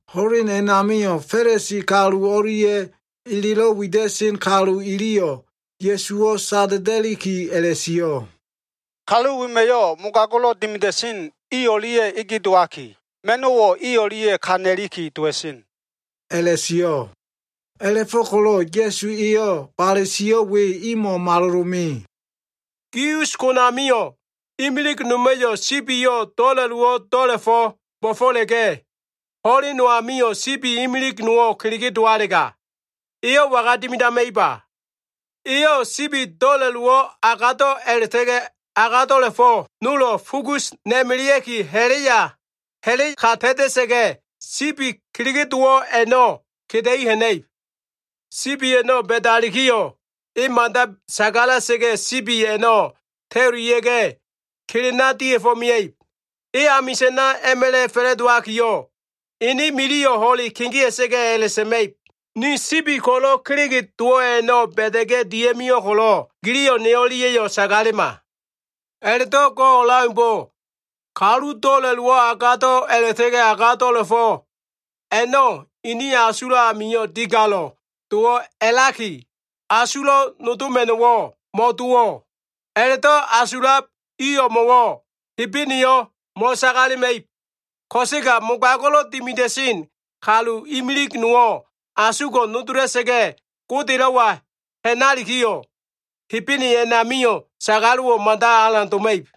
Ho꞉len a꞉namio꞉, Fa꞉lisi kalu o꞉lia꞉ elelo꞉ wida꞉sen kalu iliyo꞉ Ya꞉suwo꞉ sada꞉da꞉liki a꞉la꞉sio꞉, “Kalu wema꞉yo꞉ mogago꞉lo꞉ dimida꞉sen i o꞉lia꞉ ege dowaki, ma꞉no꞉wo꞉ i o꞉lia꞉ ka na꞉liki dowa꞉sen” a꞉la꞉sio꞉. A꞉la꞉fo꞉ko꞉lo꞉ Ya꞉su eyo꞉ bale sio꞉ we imo꞉ malolo꞉ me. “Kalu gi us konamio꞉ imilig noma꞉yo꞉ sibiyo꞉ do꞉la꞉lowo꞉ do꞉la꞉fo꞉ bo꞉fo꞉la꞉ga꞉, ho꞉len no amio꞉ sibi imilig nowo꞉ kelege dowalega, eyo꞉ waga dimidama꞉iba? Eyo꞉ sibi do꞉la꞉lowo꞉ agado꞉ a꞉la꞉ta꞉ga꞉ agado꞉la꞉fo꞉ nolo꞉ fugus na꞉ melea꞉ki ha꞉la꞉ ka ta꞉ta꞉sa꞉ga꞉, sibi kelege dowo꞉ a꞉no꞉ keda꞉i ha꞉na꞉ib. Sibi a꞉no꞉ ba꞉dalikiyo꞉, e mada sagala꞉sa꞉ga꞉, sibi a꞉no꞉ ta꞉ulia꞉ga꞉, kelena dia꞉fo꞉ mia꞉ib. E amisa꞉na a꞉ma꞉la꞉ fa꞉la꞉dowakiyo꞉, ene miliyo꞉ ho꞉le kegea꞉sa꞉ga꞉ a꞉la꞉sa꞉ma꞉ib, ‘Ni sibi ko꞉lo꞉ kelege dowo꞉ a꞉no꞉ ba꞉da꞉ga꞉ dia꞉mio꞉ ko꞉lo꞉, giliyo꞉ ne o꞉lia꞉yo꞉ sagalema.’ A꞉la꞉do꞉ go꞉ o꞉leaumbo꞉, kalu do꞉la꞉lowo꞉ agado꞉ a꞉la꞉ta꞉ga꞉ agado꞉la꞉fo꞉ a꞉no꞉ ini asulo꞉ amio꞉ digalo꞉ dowo꞉ a꞉laki, asulo꞉ nodoma꞉no꞉wo꞉ mo꞉dowo꞉, a꞉la꞉do꞉ asulab i o꞉mo꞉wo꞉ Hebeneyo꞉ mo꞉sagalema꞉ib. Ko꞉sega mogago꞉lo꞉ dimida꞉sen kalu imilise nowo꞉ asugo꞉ nodola꞉sa꞉ga꞉, Godelo꞉wa ha꞉nalikiyo꞉, Hebene a꞉namio꞉ sagalo꞉wo꞉ mada alan doma꞉ib.”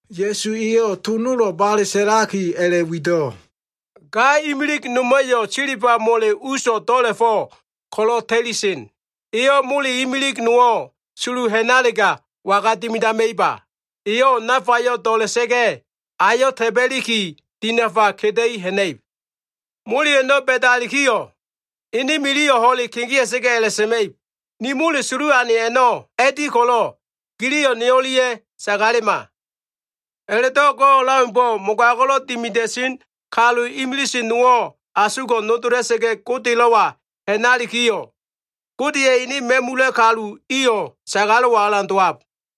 Ya꞉su eyo꞉ to nolo꞉ bale sa꞉laki a꞉la꞉wido꞉, “Ga imilig noma꞉yo꞉ silba mole uso꞉ do꞉la꞉fo꞉ ko꞉lo꞉ ta꞉lisen. Eyo꞉ mole imilig nowo꞉ sulu ha꞉nalega, waga dimidama꞉iba? Eyo꞉ nafayo꞉ do꞉la꞉sa꞉ga꞉, ayo꞉ ta꞉ba꞉liki, dinafa keda꞉i ha꞉na꞉ib. Mole a꞉no꞉ ba꞉dalikiyo꞉, ene miliyo꞉ ho꞉le kegea꞉sa꞉ga꞉ a꞉la꞉sa꞉ma꞉ib, ‘Ni mole sulu ane a꞉no꞉ a꞉di ko꞉lo꞉, giliyo꞉ ne o꞉lia꞉yo꞉ sagalema.’ A꞉la꞉do꞉ go꞉ o꞉leaumbo꞉, mogago꞉lo꞉ dimida꞉sen kalu imilise nowo꞉ asugo꞉ nodola꞉sa꞉ga꞉, Godelo꞉wa ha꞉nalikiyo꞉, Godeya꞉ ene ma꞉mula꞉ kalu iyo꞉ sagalo꞉wo꞉ alan dowab.”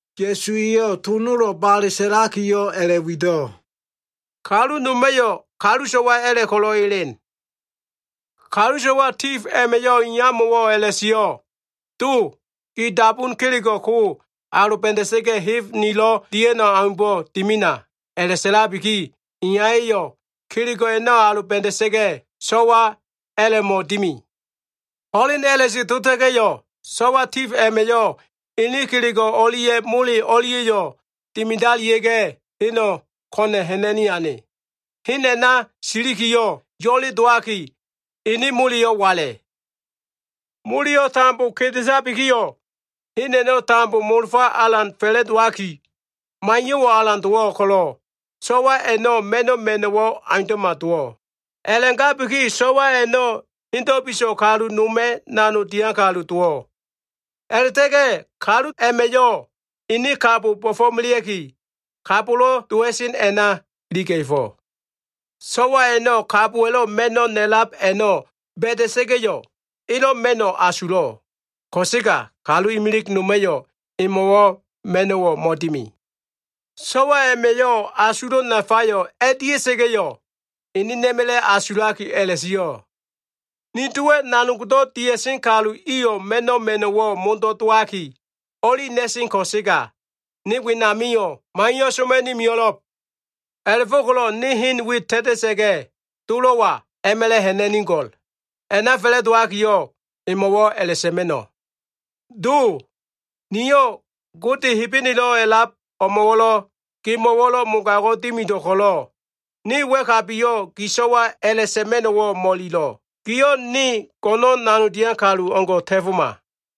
Ya꞉su eyo꞉ to nolo꞉ bale sa꞉lakiyo꞉ a꞉la꞉wido꞉, “Kalu noma꞉yo꞉ kalu so꞉wa a꞉la꞉ ko꞉lo꞉ elen. Kalu so꞉wa tif a꞉ma꞉yo꞉ iyamo꞉wo꞉ a꞉la꞉sio꞉, ‘Do, gi dabun kelego꞉ ko꞉ aloba꞉da꞉sa꞉ga꞉, heb nilo꞉ dia꞉no꞉ aumbo꞉ dimina.’ A꞉la꞉sa꞉labiki, iyaya꞉yo꞉ kelego꞉ a꞉no꞉ aloba꞉da꞉sa꞉ga꞉, so꞉wa a꞉la꞉mo꞉ dimi. Ho꞉len a꞉la꞉se dota꞉ga꞉yo꞉, so꞉wa tif a꞉ma꞉yo꞉ ene kelego꞉ o꞉lia꞉ mole o꞉lia꞉yo꞉ dimidalia꞉ga꞉, heno꞉ ko꞉na꞉ ha꞉na꞉ni ane. Hen a꞉na silikiyo꞉, yo꞉le dowaki ene moleyo꞉ wala꞉. Moleyo꞉ tambo kedetabikiyo꞉, hen a꞉no꞉ tambo molofa alan fa꞉la꞉dowaki, maiyo꞉wo꞉ alan dowo꞉ ko꞉lo꞉, so꞉wa a꞉no꞉ ma꞉no꞉ ma꞉no꞉wo꞉ aundo꞉ma dowo꞉. A꞉la꞉gabiki so꞉wa a꞉no꞉ hendo꞉ biso꞉ kalu noma꞉ nanog dian kalu dowo꞉. A꞉la꞉ta꞉ga꞉ kalu a꞉ma꞉yo꞉ ene kabo bo꞉fo꞉melea꞉ki, kabolo꞉ dowa꞉sen a꞉na iliga꞉fo꞉. So꞉wa a꞉no꞉ kabowa꞉lo꞉ ma꞉no꞉ na꞉lab a꞉no꞉ ba꞉da꞉sa꞉ga꞉yo꞉, elo꞉ ma꞉no꞉ asulo꞉. Ko꞉sega, kalu imilig noma꞉yo꞉ emo꞉wo꞉ ma꞉no꞉wo꞉ mo꞉dimi. “So꞉wa a꞉ma꞉yo꞉ asulo꞉ nafayo꞉ a꞉dia꞉sa꞉ga꞉yo꞉, enena꞉ma꞉la꞉ asulaki a꞉la꞉sio꞉, ‘Ni dowa꞉ nanogdo꞉ dia꞉sen kalu iyo꞉ ma꞉no꞉ ma꞉no꞉wo꞉ modo꞉ dowaki o꞉li na꞉sen ko꞉sega, ne wenamio꞉ maiyo꞉ soma꞉ni mio꞉lo꞉b. A꞉la꞉fo꞉ko꞉lo꞉ ne hen we ta꞉ta꞉sa꞉ga꞉, dolo꞉wa a꞉ma꞉la꞉ ha꞉na꞉nigo꞉l. A꞉na fa꞉la꞉dowakiyo꞉, emo꞉wo꞉ a꞉la꞉sa꞉ma꞉no꞉, “Do, niyo꞉ Gode Hebenelo꞉ a꞉lab o꞉mo꞉wo꞉lo꞉, gemo꞉wo꞉lo꞉ mogago꞉ dimido꞉ ko꞉lo꞉, ne wa꞉kabiyo꞉ gi so꞉wa a꞉la꞉sa꞉ma꞉no꞉wo꞉ mo꞉ililo꞉. Giyo꞉ ne go꞉no꞉n nanogdo꞉ dian kalu o꞉ngo꞉ ta꞉foma.” ’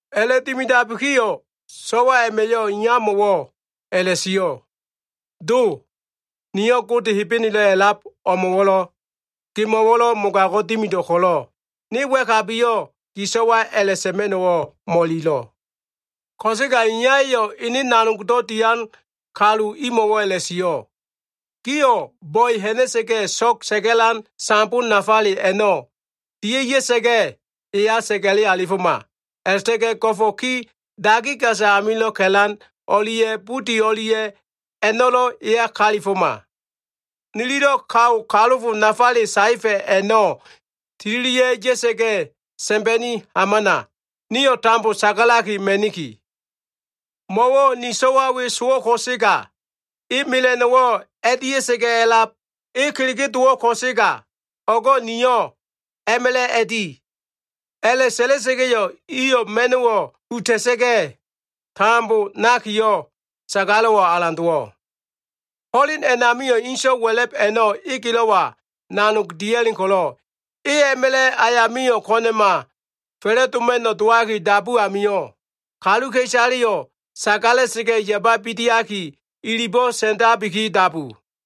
A꞉la꞉dimidabikiyo꞉ so꞉wa a꞉ma꞉yo꞉ iyamo꞉wo꞉ a꞉la꞉sio꞉, ‘Do, niyo꞉ Gode Hebenelo꞉ a꞉lab o꞉mo꞉wo꞉lo꞉, gemo꞉wo꞉lo꞉ mogago꞉ dimido꞉ ko꞉lo꞉, ne wa꞉kabiyo꞉ gi so꞉wa a꞉la꞉sa꞉ma꞉no꞉wo꞉ mo꞉ililo꞉.’ Ko꞉sega iyaya꞉yo꞉ ene nanogdo꞉ dian kalu imo꞉wo꞉ a꞉la꞉sio꞉, ‘Gio꞉ bo꞉e ha꞉na꞉sa꞉ga꞉, so꞉g sa꞉ga꞉lan sambo nafale a꞉no꞉ dia꞉ya꞉sa꞉ga꞉, eya sa꞉ga꞉le alifoma. A꞉la꞉ta꞉ga꞉ go꞉fo꞉ ki dagi gasa amilo꞉ ka꞉lan o꞉lia꞉ budi o꞉lia꞉ a꞉no꞉lo꞉ eya kalifoma. Nililo꞉ kao kalofo nafale saefa꞉ a꞉no꞉ tililia꞉ ya꞉sa꞉ga꞉, sa꞉mba꞉ni hamana. Nio꞉ tambo sagalaki ma꞉niki. Mo꞉wo꞉ ni sowa꞉ we sowo꞉ ko꞉sega e mela꞉no꞉wo꞉ a꞉dia꞉sa꞉ga꞉ a꞉lab. E kelege dowo꞉ ko꞉sega o꞉go꞉ niyo꞉ a꞉ma꞉la꞉ a꞉di.’ A꞉la꞉sa꞉la꞉sa꞉ga꞉yo꞉ iyo꞉ ma꞉no꞉wo꞉ uta꞉sa꞉ga, tambo nakiyo꞉, sagalo꞉wo꞉ alan dowo꞉. “Ho꞉len a꞉namio꞉ inso꞉ wa꞉la꞉b a꞉no꞉ egelo꞉wa nanog dia꞉len ko꞉lo꞉, e a꞉ma꞉la꞉ ayamio꞉ ko꞉na꞉ma fa꞉la꞉doma꞉no꞉ dowaki dabu amio꞉, kaluka꞉isaleyo꞉ sagala꞉sa꞉ga꞉ yababi diaki, ilibo꞉ sa꞉ndabiki dabu.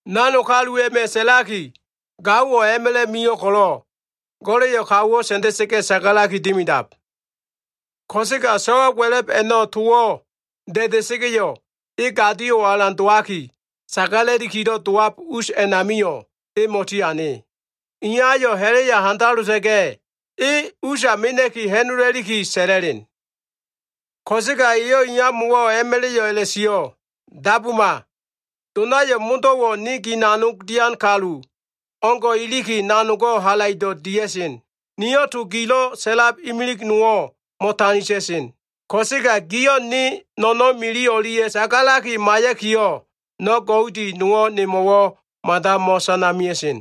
Nanog kalu a꞉ma꞉ sa꞉laki, ‘Gaowo꞉ a꞉ma꞉la꞉ mio꞉ ko꞉lo꞉, go꞉la꞉yo꞉ kaowo꞉ sa꞉nda꞉sa꞉ga꞉ sagalaki dimidab.’ Ko꞉sega so꞉wa wa꞉la꞉b a꞉no꞉ towo꞉ da꞉da꞉sa꞉ga꞉yo꞉, e gadio꞉wo꞉ alan dowaki, sagala꞉likilo꞉ dowab us a꞉namio꞉ mo꞉tiane. Iyayo꞉ ha꞉la꞉ya handalota꞉ga꞉, e usa mena꞉ki ha꞉nola꞉liki sa꞉la꞉len. Ko꞉sega eyo꞉ iyamo꞉wo꞉ a꞉ma꞉la꞉yo꞉ a꞉la꞉sio꞉, ‘Dabuma! Donayo꞉ modo꞉wo꞉ ne gi nanog dian kalu o꞉ngo꞉ iliki, nanogo꞉ halaido꞉ dia꞉sen. Niyo꞉ to gilo꞉ sa꞉lab imilig nowo꞉ mo꞉ta꞉ta꞉sen. Ko꞉sega giyo꞉ ne no꞉no꞉n mili o꞉lia꞉ sagalaki maiya꞉kiyo꞉, no꞉ goudi nowo꞉ nemo꞉wo꞉ mada mo꞉sana mia꞉sen.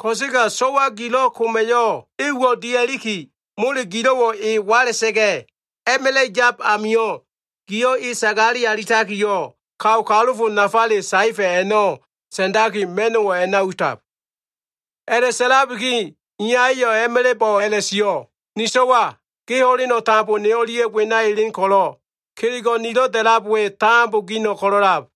Ko꞉sega so꞉wa gilo꞉ koma꞉yo꞉, e uwo꞉ dia꞉liki mole gilo꞉wo꞉ e wala꞉sa꞉ga꞉, a꞉ma꞉la꞉ yab amio꞉, giyo꞉ e sagale alitakiyo꞉, kao kalofo nafale saefa꞉ a꞉no꞉ sa꞉ndaki, ma꞉no꞉wo꞉ a꞉na utab.’ “A꞉la꞉sa꞉labiki iyaya꞉yo꞉ a꞉ma꞉la꞉bo꞉ a꞉la꞉sio꞉, ‘Ni so꞉wa, ge ho꞉leno꞉ tambo ne o꞉lia꞉ wena elen ko꞉lo꞉, kelego꞉ nilo꞉ da꞉lab we tambo gino꞉ ko꞉lo꞉lab.